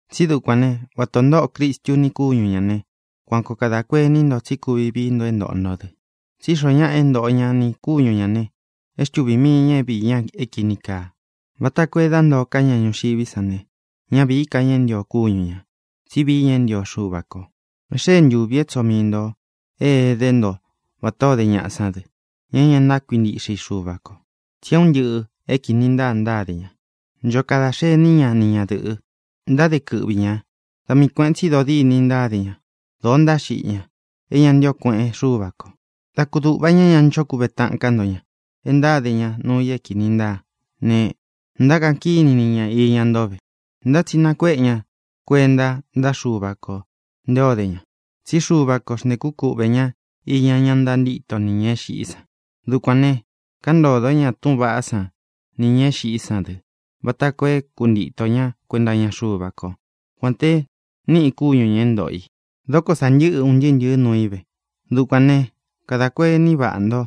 Tsi dúkuān né, vata ō ntóꞌo Cristu ni kúñu ñā ne, kuan koo kadā kuení nto tsí kuvi vií nto é ntōꞌo nto dɨ. Tsí xoo ñáꞌa e ntóꞌo ña nī kúñu ñā ne, é xtuvī mii ña é viī ña é kīni kaa, vata koo e dá ntōo ká ña ñuxiví san ne, ñá vīí ka ña é ntio kúñu ñā, tsí vií ña é ntio Xuva kō. E xée ntuvi é tsoo mii ntō é edé nto vatā o dé ñaꞌa sán dɨ, ña é ña ntákuintiꞌxe i Xuva kō. Tsi é un ntɨꞌɨ̄ é kīni ntáa ntáde ña. Ncho kada xení ña ni ñadɨ̄ꞌɨ. Ntáde kɨꞌvi ñā. Da mii kuēꞌen tsi dodîni ntáde ña. Dōo ntáxiꞌi ña. Ntaínúu ini ña tuku xuva ñā e ña ntío kueꞌen Xúva kō. Dā kúduꞌva ña e ñá ncho kuve taꞌan ká nto ña e ntáde ña nuu i é kīni ntáa ne, ntákaꞌan kíni ña iña nto ve. Ntá tsi nakuéꞌe ña kuenta ntáꞌa Xuva kō nté o dé ña. Tsí Xuva ko xntēkú kuꞌvē ña iña ñá ntantíto nī ña é xiꞌí san. Dukuān ne, káꞌan ntōdó ña túꞌūn vaꞌá san nī ña é xiꞌí san dɨ vata koo é kuntīto ña kuenta iña Xuva kó, kuān te niꞌi kúñu ñā é ntōꞌo i. Dóko sā ntɨ́ꞌɨ un ntɨɨ́ ntɨ̄ɨ́ nuu í ve. Dukuān né, kadā kuení vaꞌa nto.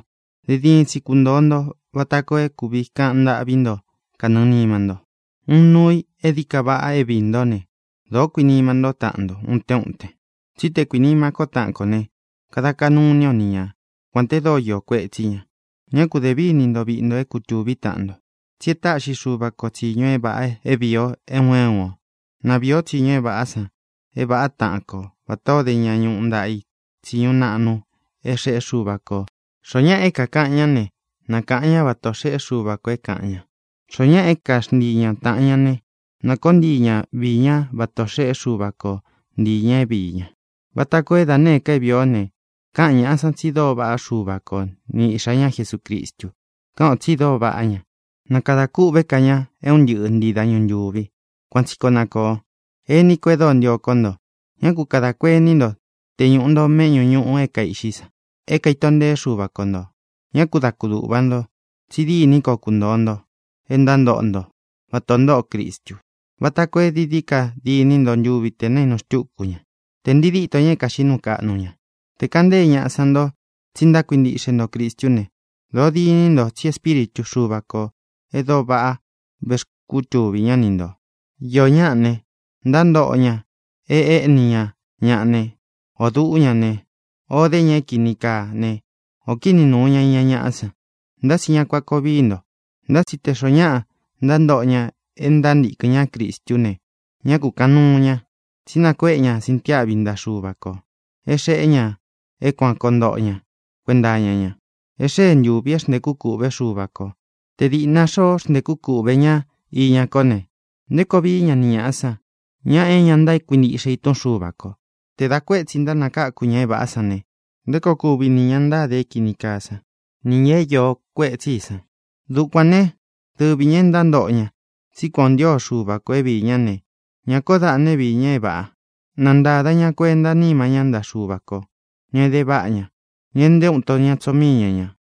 Diin diin tsi kuntōo nto vata koo é kūvi kaꞌan ntâꞌví nto kanɨɨ̄ nima nto. Uun nuu i e dií ka vaꞌa é viī ntó ne: dōó kuinima ntó taꞌan nto utén uten. Tsí te kuīnima kó taꞌan kō ne, kada kaꞌnu iní o ni ña, kuān te dóo iō kuetsí ña. Ñá ku dē víni nto viꞌi nto é kutūví taꞌan nto. Tsí e táꞌxi Xuva ko tsīñu é vāꞌa é vīi o é un é un ō. Na viī ó tsiñu é vāꞌá san é vāꞌá taꞌan ko vatā ó de ña ñuꞌu ntaꞌa i tsiñu naꞌnu é xeꞌé Xuva kō. Xoó ñaꞌa é kākaꞌan ñá ne, na kāꞌan ñá vata ō xeꞌé Xuva kō é kāꞌan ña. Xoó ñaꞌa é kaxntii ña tāꞌan ña ne, na kōó ntii ña viī ñá vata ō xeꞌé Xuva ko ntii ñā é viī ñá, vata koo é da nēé ka é vīi ó ne, káꞌan ñāꞌa sán tsi dóo vaꞌá Xuva ko ni iꞌxā ñá Jesucristu. Káꞌan ō tsi dóo vaꞌá ña. Na kadā kûꞌvé ka ña é un ntɨꞌɨ ntii dañu ntūvi. Kuan tsi koo na kōo. Ení ko e dóo ntio kó nto, ñá ku kadā kuení nto te ñūꞌu nto méꞌñū ñuꞌu é kaīꞌxí san é kaīto nteé Xuva ko ntō. Ñá ku da kudūꞌva nto, tsi dîní koo kuntōo nto e ntántoꞌo nto vata ō ntóꞌo Cristu, vata koo é dií dií ka diní nto ntuvi tē naínu xtúku ña, tē ntii dítō ña é kāxiꞌí nuu kaꞌnu ña. Te kāꞌan ntée ñaꞌa san nto tsi ntákuintiꞌxe nto Cristu ne, dōó diní nto tsi Espíritu Xuva kō e dóo vaꞌa vexkútuvī ñá ni ntō. Īó ñaꞌa ne, ntántoꞌo ña e éꞌni ña ñaꞌa ne, ō duꞌu ña ne, o dé ña é kīni kaa ne, ō kini nuu ña iña ñaꞌá san. Nta tsi ña kuān koo vií nto. Ntá tsi te xoó ñaꞌa ntántoꞌo ña e ntántīkɨn ñá Cristú ne, ñá kūkaꞌan nuu ña. Tsí nakuéꞌe ña sintiáꞌvi ntaꞌa Xuva kō é xeꞌé ña é kuān koo ntoꞌo ña kuenta iña ña. E xée ntūvi é xntēkú kūꞌvé Xuva kō. Te dīꞌna xoꞌo xntekú kuꞌvē ñá iña kó ne, ¿nté koo vií ña ni ñāꞌa san, ña é ña ntákuintiꞌxe i túꞌun Xuva kō? Tē dá kuētsi ntánakáku ña é vāꞌá san ne, ¿nté koo kuvi nī ña ntáde é kīni kaá san, nī ña é iō kuetsí i san? Dukuān né, dɨvi ñā e ntántoꞌo ña tsí kuān o ntío Xuva kō é viī ñá ne, ñá kōó daꞌna é viī ña é vāꞌa. Na ntāda ña kuentá nima ñá ntaꞌa Xúva kō, ña é ede váꞌa ña, ña e nté uun ito ña tsoo míi ña ñā.